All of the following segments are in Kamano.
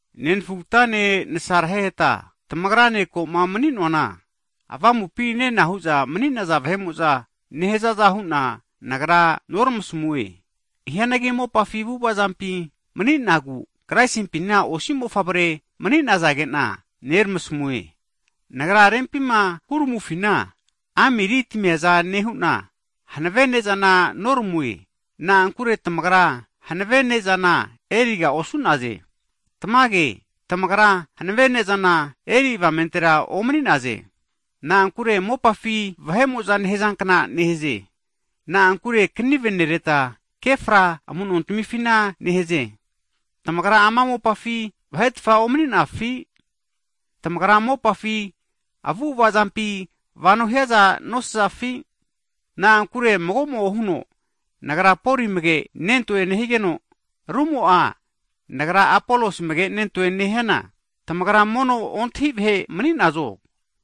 Nenafugatane nasareheta tamagra ne ko'ma mani'noana, avamupi nena hu'za mani'naza vahe'mo'za nehazaza hu'na nagra noramasamue. Hianagi mopafi avu'avazampi mani'nagu Kraisimpina osi mofavre mani'nazage'na neramasmue. Nagra rempima huramufina amiri tamiaza nehu'na, hanave ne'zana noramue, na'ankure tamagra hanave ne'zana eriga osu'naze. Tamage, tamagra hanave ne'zana eri avamentera omani'naze. Na'ankure mopafi vahe'mo'za nehazankna nehaze. Na'ankure knive nereta, ke fra amu'nontamifina nehaze. Tamagra ama mopafi vahe'tfa omani'nafi? Tamagra mopafi avu'ava zampi vano hiaza nosazafi? Na'ankure mago'mo'a huno, nagra Poli amage nentoe nehigeno, rumo'a nagra Apolos amage nentoe nehiana, tamagra mono ontahi vahe mani'nazo?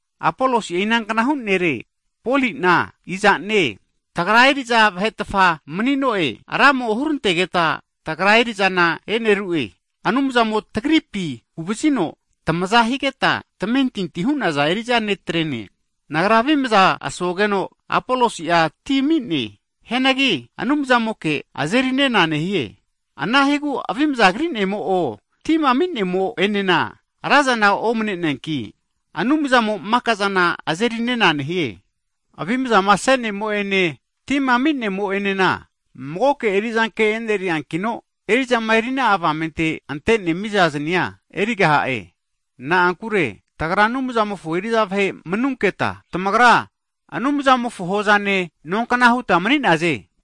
Apolosi'a inanknahu nere? Poli'na iza'ne? Tagra eri'za vahetfa mani'no'e. Ramo hurantegeta tagra eri'zana e'neru'e. Anumzamo tagripi huvazino tamaza higeta tamentinti'a hu'naza eri'za ne' tre'ne. Nagra avimza asogeno, Apolosi'a ti ami'ne. Hianagi Anumzamoke azeri nena nehie. Anahigu avimza kri'nemo' o tima ami'nemo enena razana omne'neanki, Anumzamo maka zana azerinena nehie. Avimzama ase'nemo'ene tima ami'nemo enena magoke eri'zanke e'neriankino, eri'zama eri'na'a avamente ante'ne miza zani'a erigaha'e. Na'ankure tagra Anumzamofo eri'za vahe manuketa, tamagra Anumzamofo hozane, nonkna hutma mani'naze.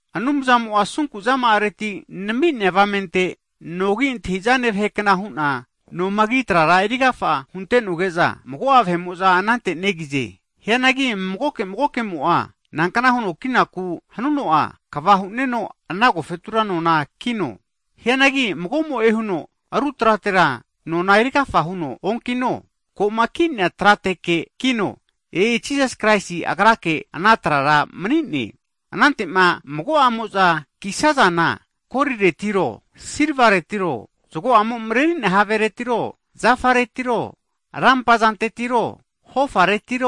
Anumzamo'a asunku zama'areti nami'nea avamente, nogi antahi'zane vahekna hu'na nomagi trara eri agafa hunte'noge'za, mago'a vahe'mo'za anante negize. Hianagi magoke magokemo'a, nankna huno kinaku hanuno'a, kva hu'neno ana agofetura nona kino. Hianagi mago'mo'e huno ru tratera nona eri agafa huno onkino, ko'ma ki'nea trateke kino, e'i Jisas Kraisi Agrake ana trara mani'ne. Anante'ma mago'amo'za kisazana koliretiro, silva retiro, zgo'amo mreri'nea haveretiro, zafaretiro, rampa zantetiro, hofareti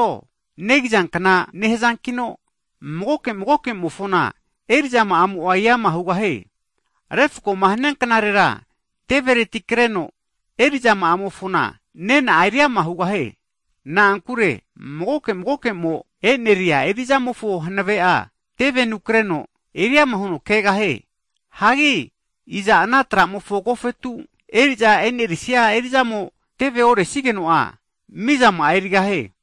negizankna nehazankino, magoke magokemofona eri'zama'amo'a eama hugahie. Refkoma hania knarera tevereti kreno eri'zama'amofona nena'a eriama hugahie. Na'ankure magoke magokemo e'neria eri'zamofo hanave'a, tevenu kreno eriama huno kegahie. Hagi iza ana tra'mofo agofetu eri'za eri'nesia eri'zamo tevema oresigeno'a, mizama'a erigahie.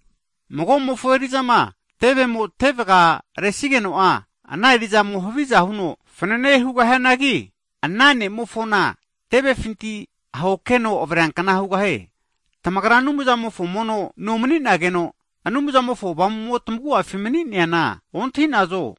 Mago'mofo eri'zama tevemo tevga resigeno'a, ana eri'zamo'a haviza huno fanane hugahianagi, ana ne'mofona, tevefinti ahokeno avreankna hugahie. Tamagra Anumzamofo mono no mani'nageno, Anumzamofo Avamu'mo'ma tamagu'afima mani'neana ontahi'nazo?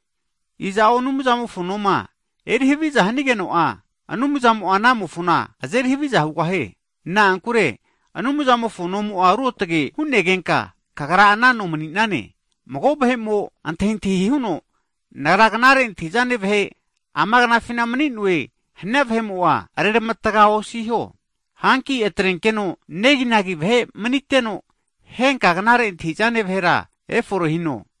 Iza'o Anumzamofo noma erihaviza hanigeno'a, Anumzamo'a anamofona azeri haviza hugahie. Na'ankure Anumzamofo nomo'a ruotge hu'negenka, kagra ana no mani'nane. Mago vahe'mo antahintahi huno, nagra knare antahi'zane vahe ama knafina mani'noe hania vahe'mo'a, agra'a ravatga osino. Hanki atrenkeno neginagi vahe maniteno, henka knare antahi'zane vahera efore hino.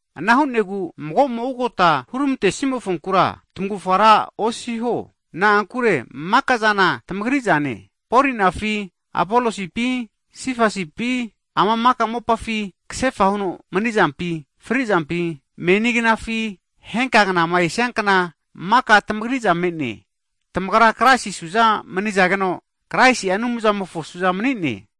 Ana hu'negu mago'mo ugota hurmante'simofonkura tmavufa ra osiho, na'ankure maka'zana tmagri'zane. Poli'na fi, Apolosi pi, Sefasi pi (Pita), ama mopafi kasefa huno mni'zampi, fri zampi, meni knafi, henkama esiankna maka tamagri'za me'ne. Tamagra Kraisi suza manizageno, Kraisi'a Anumzamofo su'za mani'ne.